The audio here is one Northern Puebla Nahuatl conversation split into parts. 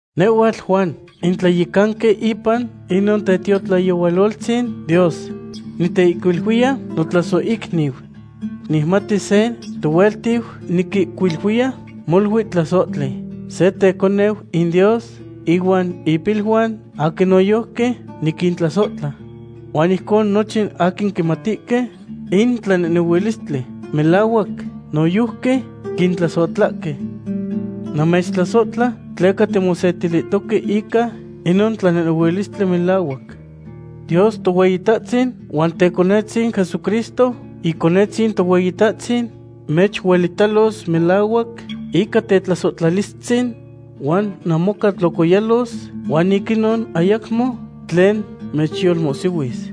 Nehhuatl Juan, in tlayecanqui ipan inon tetiotlayehualoltzin Dios. Niteihcuiluiya, notlasohicniu. Nicmati se tohueltiu niquihcuiluiya molui tlasohtli, se teconeu in Dios, ihuan ipiluan aquin noyojqui niquintlasohtla. Huan ijcon nochin aquin quimatihque in tlanehnehuilistli melahuac noyojqui quintlasohtlahque. Namechtlasohtla tleca timosetilihtoque ica inon tlanehnehuilistli melahuac. Dios Tohueyitahtzin huan Totecohtzin Jesucristo Iconetzin Tohueyitahtzin mechuelitalos melahuac ica tetlasohtlalistzin huan namoca tlocoyalos huan ic inon ayacmo tlen mechyolmohsihuis.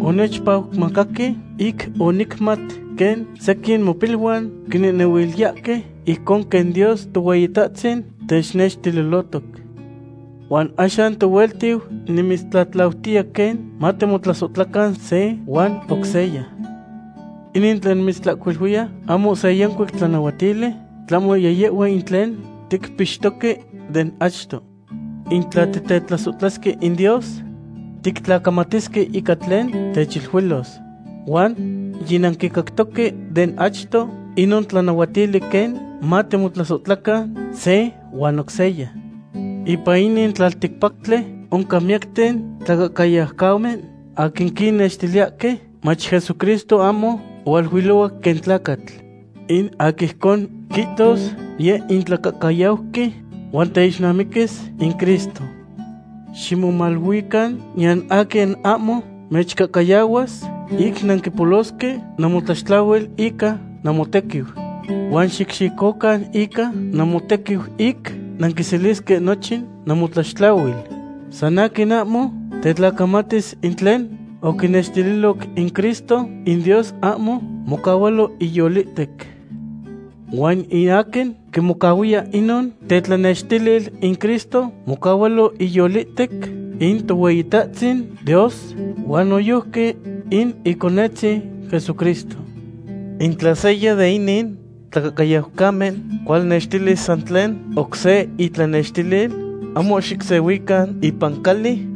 Onechpacmacahque ic onicmat quen sequin mopiluan quinehnehuiliyahque ijcon quen Dios Tohueyitahtzin technextililohtoc. Huan axan tohueltiu, nimitztlatlautiya quen matimotlasohtlacan se huan oc seya. Inin tlen nimitzihcuiluiya ahmo se yancuic tlanahuatili, tlahmo yiyehhua in tlen ticpixtoque den achto. In tla titetlasohtlasque in Dios, tictlacamatisque ica tlen techiluilos. Huan yinanquicactoque den achto inon tlanahuatili quen matimotlasohtlacan se huan oc seya. Ipan in tlalticpactli oncan miyacten tlacahcayaucamen, aquin quinnextiliyahque mach Jesucristo ahmo ohualuilohuac quen tlacatl. In aquin ijcon quihtos, yeh in tlacahcayauqui huan teixnamiquis in Cristo. Ximomaluican niyan aquin ahmo mechcahcayahuas ic nanquipolosque namotlaxtlahuil ica namotequiu. Huan xicxicocan ica namotequiu ic nanquiselisque nochin namotlaxtlahuil. San aquin ahmo tetlacamatis in tlen oquinextililoc in Cristo, in Dios ahmo mocahualo iyolihtec. Huan in aquin quimocahuiya inon tetlanextilil in Cristo, mocahualo iyolihtec in Tohueyitahtzin Dios huan noyojqui in Iconetzin Jesucristo. In tla seya de inin tlacahcayaucamen cualnextilis san tlen oc se intlanextilil, ahmo xicsehuican ipan cali,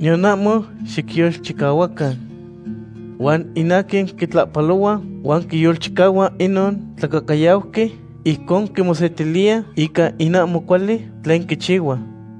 niyan ahmo xicyolchicahuacan. Huan in aquin quitlahpalohua huan quiyolchicahua inon tlacahcayauqui ijcon quimosetiliya ica in ahmo cuali tlen quichihua.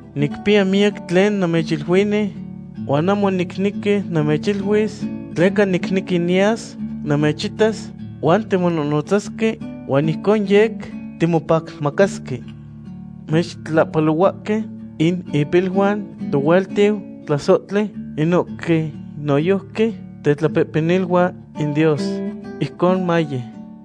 Nicpiya miyac tlen namechiluini, huan ahmo nicnequi namechihcuiluis, tleca nicnequi niyas namechitas huan timonohnotzasque, huan ijcon yec timopacmacasque. Mechtlahpalohuahque in ipiluan tohueltiu tlasohtli, inohque noyojqui tetlapehpeniluan in Dios. Ijcon maye.